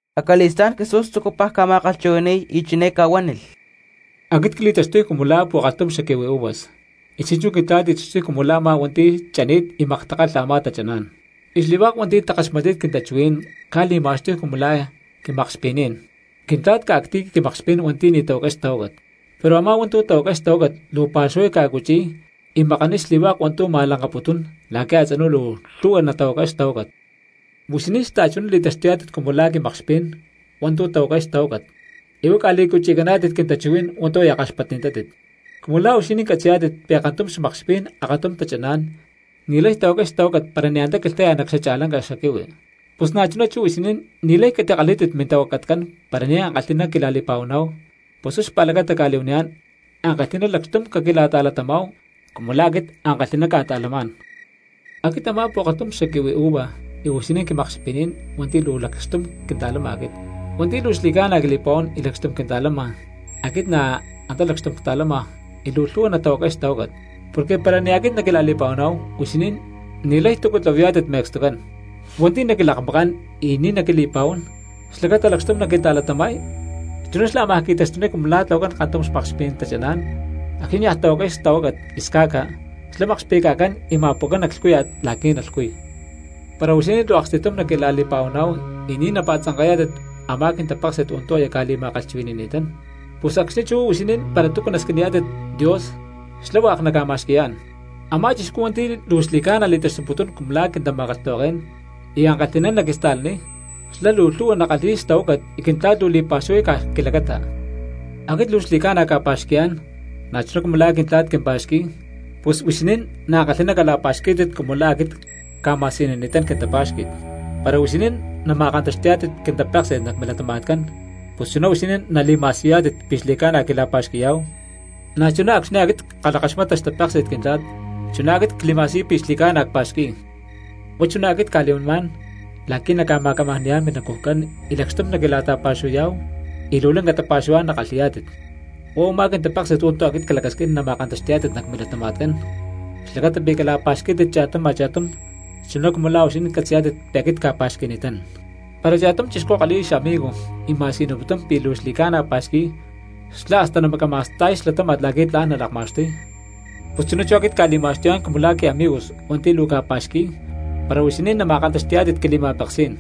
Acali̠stá̠n Jesús tzucupaj ca̠ma̠kalhchuhui̠ni̠y y chiné ca̠huánilh: —Aquit cli̠taxtuy cumu la̠ pu̠kalhtum xaquihui uvas, y chi̠nchú Quintla̠t li̠taxtuy cumu la̠ a̠má hua̠nti̠ chani̠t y maktakalha a̠má tachaná̠n. Y xli̠hua̠k hua̠nti̠ takaxmatni̠t quintachuhuí̠n cca̠li̠ma̠xtuy cumu la̠ quimakxpi̠ní̠n. Quintla̠t ca̠cti̠y quimakxpí̠n hua̠ntu̠ ni̠ tahuacay xtahuácat, pero a̠má hua̠ntu̠ tahuacay xtahuácat luu pa̠xuhuay ca̠cuchi̠y y makaniy xli̠hua̠k hua̠ntu̠ ma̠lanka̠putún la̠qui̠ a̠tzinú luu lhu̠hua natahuacay xtahuácat. Huixinín xta̠chuná li̠taxtuyá̠tit cumu la̠ quimakxpí̠n hua̠ntu̠ tahuacay xtahuácat, y huá ca̠li̠cuchi̠cani̠tátit quintachuhuí̠n hua̠ntu̠ aya kaxpatni̠tátit. Cumu la̠ huixinín catzi̠yá̠tit pi̠ kantum xmakxpí̠n akatum tachaná̠n ni̠lay tahuacay xtahuácat para ni̠ antá quilhta̠yá nac xacha̠lanca xaquihui, pus na̠chuná chú huixinín ni̠lay catikalhí̠tit mintahuacatcán para ni̠ ankalhi̠ná quila̠li̠pa̠huaná̠hu, pus huá xpa̠lacata cca̠li̠huaniyá̠n ankalhi̠ná lacxtum caquila̠ta̠latamá̠hu cumu la̠ aquit ankalhi̠ná cca̠ta̠lamá̠n. ’Aquit a̠má pu̠kalhtum xaquihui uva y huixinín quimakxpi̠ní̠n hua̠nti̠ luu lacxtum quinta̠lama aquit. Hua̠nti̠ luu xli̠ca̠na quili̠pa̠huán y lacxtum quinta̠lama aquit na̠ antá lacxtum cta̠lama y luu lhu̠hua natahuacay xtahuácat, porque para ni̠ aquit naquila̠li̠pa̠huaná̠hu huixinín ni̠lay túcu tlahuayá̠tit me̠cstucán. Hua̠nti̠ naquilakmakán y ni̠ naquili̠pa̠huán xlacata lacxtum naquinta̠latama̠y, chuná xlá ámaj qui̠taxtuniy cumu la̠ tlahuacán kantum xmakxpí̠n tachaná̠n acxni̠ niaj tahuacay xtahuácat y sca̠ca, xlá makxpi̠ca̠cán y ma̠pu̠cán nac lhcúya̠t la̠qui̠ nalhcuy. ’Para huixinín luu aksti̠tum naquila̠li̠pa̠huaná̠hu y ni̠ napa̠tzanka̠yá̠tit a̠má quintapéksi̠t hua̠ntu̠ aya cca̠li̠ma̠kalhchuhui̠ni̠ni̠tán, pus acxni̠ chú huixinín para túcu nasquiniyá̠tit Dios xlá hua̠k naca̠ma̠xqui̠yá̠n. Amá chixcú hua̠nti̠ luu xli̠ca̠na li̠taxtuputún cumu la̠ quintama̠kalhtahuaké̠n y ankalhi̠ná naquista̠laniy, xlá luu lhu̠hua nakalhi̠y xtahuácat y Quintla̠t luu li̠pa̠xuhuay caj quilacata. Aquit luu xli̠ca̠na cca̠pa̠xqui̠yá̠n na̠chuná cumu la̠ Quintla̠t quim- pa̠xqui̠y, pus huixinín na̠ ankalhi̠ná cala̠pa̠xqui̠pítit chuná cumu la̠ aquit cca̠ma̠siyunini̠tán quintapá̠xqui̠t. Para huixinín nama̠kantaxti̠yá̠tit quintapéksi̠t nac milatama̠tcán pus chuná huixinín nali̠ma̠siyuyá̠tit pi̠ xli̠ca̠na quila̠pa̠xqui̠yá̠hu, na̠chuná acxni̠ aquit ckalhakaxmata xtapéksi̠t Quintla̠t chuná aquit cli̠ma̠siyuy pi̠ xli̠ca̠na cpa̠xqui̠y. ’Huá chuná aquit cca̠li̠huanimá̠n la̠qui̠ naca̠ma̠camajni̠yá̠n minacujcán y lacxtum naquila̠ta̠pa̠xuhuayá̠hu y luu lanca tapa̠xuhuá̠n nakalhi̠yá̠tit. Huá u̠má quintapéksi̠t hua̠ntu̠ aquit clacasquín nama̠kantaxti̠yá̠tit nac milatama̠tcán, xlacata pi̠ cala̠pa̠xqui̠pítit cha̠tum a̠cha̠tum chuná cumu la̠ huixinín catzi̠yá̠tit pi̠ aquit cca̠pa̠xqui̠ni̠tán. Para cha̠tum chixcú kalhi̠y xamigo y ma̠siyuniputún pi̠ luu xli̠ca̠na pa̠xqui̠y xlá hasta namacama̠sta̠y xlatáma̠t la̠qui̠ tla̠n nalakma̠xtuy, pus chuná aquit cca̠li̠ma̠xtuyá̠n cumu la̠ quiamigos hua̠nti̠ luu cca̠pa̠xqui̠y para huixinín nama̠kantaxti̠yá̠tit quili̠ma̠peksí̠n.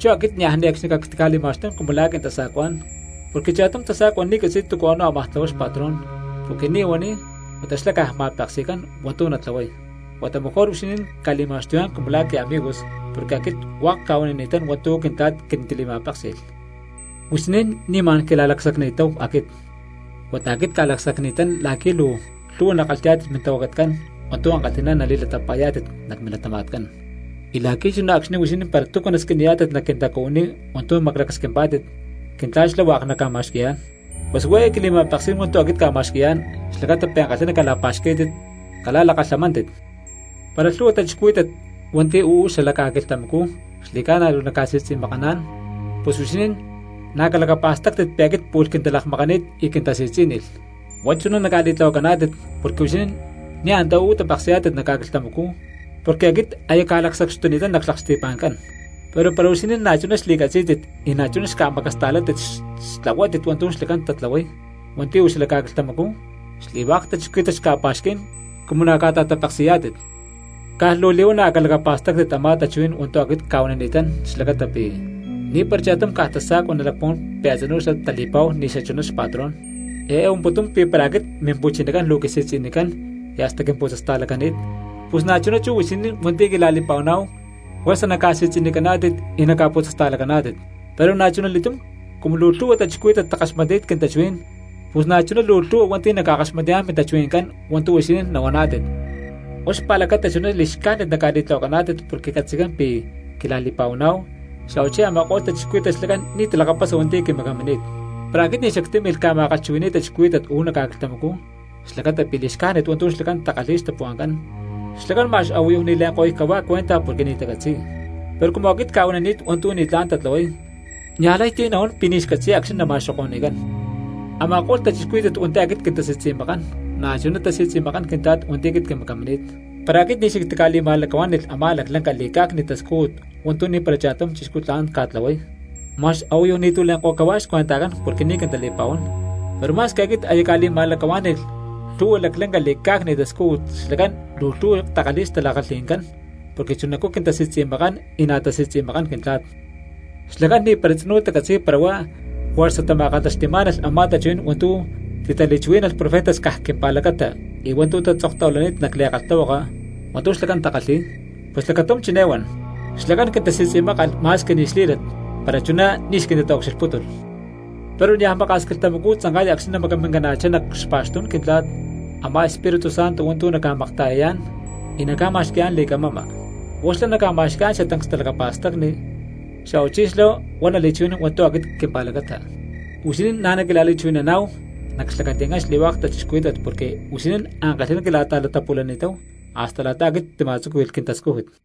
Chú aquit niaj ne̠cxni cactica̠li̠ma̠xtún cumu la̠ quintasa̠cuá̠n porque cha̠tum tasa̠cua ni̠ catzi̠y túcu a̠nú ámaj tlahuay xpatrón porque ni̠ huaniy huata xlá caj ma̠peksi̠cán hua̠ntu̠ natlahuay. Huata mejor huixinín cca̠li̠ma̠xtuyá̠n cumu la̠ quiamigos porque aquit hua̠k cca̠huanini̠tán hua̠ntu̠ Quintla̠t quintili̠ma̠péksi̠lh. Huixinín ni̠ ma̠n quila̠lacsacni̠táhu aquit, huata aquit cca̠lacsacni̠tán la̠qui̠ luu lhu̠hua nakalhi̠yá̠tit mintahuacatcán hua̠ntu̠ ankalhi̠ná nali̠latapa̠yá̠tit nac milatama̠tcán, y la̠qui̠ chuná acxni̠ huixinín para túcu nasquiniyá̠tit nac quintacuhuiní hua̠ntu̠ maclacasquimpá̠tit, Quintla̠t xlá hua̠k naca̠ma̠xqui̠yá̠n. Pus huá eé quili̠ma̠peksí̠n hua̠ntu̠ aquit cca̠ma̠xqui̠yá̠n xlacata pi̠ ankalhi̠ná cala̠pa̠xquí̠tit cala̠lakalhamántit. ’Para lhu̠hua cristianos hua̠nti̠ uú xala ca̠quilhtamacú xli̠ca̠na luu naca̠si̠tzi̠makaná̠n pus huixinín na̠ calacapa̠stáctit pi̠ aquit pu̠lh quintalakmakani̠t y quintasi̠tzí̠nilh. Huá chuná naca̠li̠tlahuacaná̠tit porque huixinín ni̠ antá uú tapeksi̠yá̠tit nac ca̠quilhtamacú porque aquit aya cca̠lacsacxtuni̠tán nac xlaksti̠pa̠ncán; pero para huixinín na̠chuná xli̠catzí̠tit y na̠chuná xca̠macasta̠látit xtlahuátit hua̠ntu̠ xlacán tatlahuay hua̠nti̠ uú xala ca̠quilhtamacú, xli̠hua̠k cristianos xca̠pa̠xquí̠n cumu na̠ ca̠ta̠tapeksi̠yá̠tit. Caj luu li̠huana̠ calacapa̠stáctit a̠má tachuhuí̠n hua̠ntu̠ aquit cca̠huanini̠tán xlacata pi̠: “Ni̠para cha̠tum caj tasa̠cua nalacpuhuán pi̠ a̠tzinú xlá tali̠pa̠hu ni̠ xachuná xpatrón.” Eé huamputún pi̠ para aquit Mimpu̠chinacán luu quisi̠tzi̠nicán y hasta quimputzasta̠lacani̠t, pus na̠chuná chú huixinín hua̠nti̠ quila̠li̠pa̠huaná̠hu juerza naca̠si̠tzi̠nicaná̠tit y naca̠putzasta̠lacaná̠tit. Pero na̠chuna li̠túm cumu luu lhu̠hua cristianos takalhakaxmatni̠t quintachuhuí̠n pus na̠chuná luu lhu̠hua hua̠nti̠ naca̠kaxmatniyá̠n mintachuhui̠ncán hua̠ntu̠ huixinín nahuaná̠tit. Huá xpa̠lacata chuná li̠xcájnit naca̠li̠tlahuacaná̠tit porque catzi̠cán pi̠ quila̠li̠pa̠huaná̠hu, xa̠huachí a̠ma̠ko̠lh cristianos xlacán ni̠ talakapasa hua̠nti̠ quimacamini̠t. ’Para aquit ni̠ xactímilh ca̠ma̠kalhchuhui̠ni̠y cristianos uú nac ca̠quilhtamacú xlacata pi̠ li̠xcájnit hua̠ntu̠ xlacán takalhi̠y xtapuhua̠ncán xlacán ma̠x a̠huayu ni̠ le̠nko̠y cahuá cuenta porque ni̠ tacatzi̠y. Pero cumu aquit cca̠huanini̠t hua̠ntu̠ ni̠tlá̠n tatlahuay, niaj lay ti̠ nahuán pi̠ ni̠ xcatzi̠y acxni̠ nama̠xoko̠ni̠cán. Ama̠ko̠lh cristianos hua̠nti̠ aquit quintasi̠tzi̠makán, na̠chuná tasi̠tzi̠makán Quintla̠t hua̠nti̠ quimacamini̠t. Para aquit ni̠ xactica̠li̠ma̠lacahuá̠ni̠lh a̠má laclanca li̠cá̠cni̠t tascújut hua̠ntu̠ ni̠para cha̠tum chixcú tla̠n ca̠tlahuay, ma̠x a̠huayu ni̠tu̠ le̠nko̠y cahuá xcuentajcán porque ni̠ quintali̠pa̠huán; pero ma̠squi aquit aya cca̠li̠ma̠lacahuá̠ni̠lh lhu̠hua laclanca li̠cá̠cni̠t tascújut xlacán luu lhu̠hua takalhi̠y xtala̠kalhi̠ncán porque chunacú quintasi̠tzi̠makán y na̠ tasi̠tzi̠makán Quintla̠t. Xlacán ni̠para tzinú tacatzi̠y para huá juerza tama̠kantaxti̠má̠nalh a̠má tachuhuí̠n hua̠ntu̠ titali̠chuhuí̠nalh profetas caj quimpa̠lacata y hua̠ntu̠ tatzoktahuilani̠t nac li̠kalhtahuaka hua̠ntu̠ xlacán takalhi̠y. Pus lacatum chiné huan: “Xlacán quintasi̠tzi̠mákalh ma̠squi ni̠ xlí̠lat para chuná ni̠ xquintitaucxilhpútulh.” ’Pero niaj maka̠s quilhtamacú tzanka̠y acxni̠ nacmacamina̠chá nac xpa̠xtú̠n Quintla̠t a̠má Espíritu Santo hua̠nti̠ naca̠makta̠yayá̠n y naca̠ma̠xqui̠yá̠n li̠camama. Huá xlá naca̠ma̠xqui̠yá̠n xatancs talacapa̠stacni, xa̠huachí xlá huá nali̠chuhui̠nán hua̠ntu̠ aquit quimpa̠lacata. Huixinín na̠ naquila̠li̠chuhui̠naná̠hu nac xlacati̠ncán xli̠hua̠k cristianos porque huixinín ankalhi̠ná quila̠ta̠latapu̠li̠ni̠táhu hasta la̠ta aquit ctima̠tzúqui̠lh quintascújut.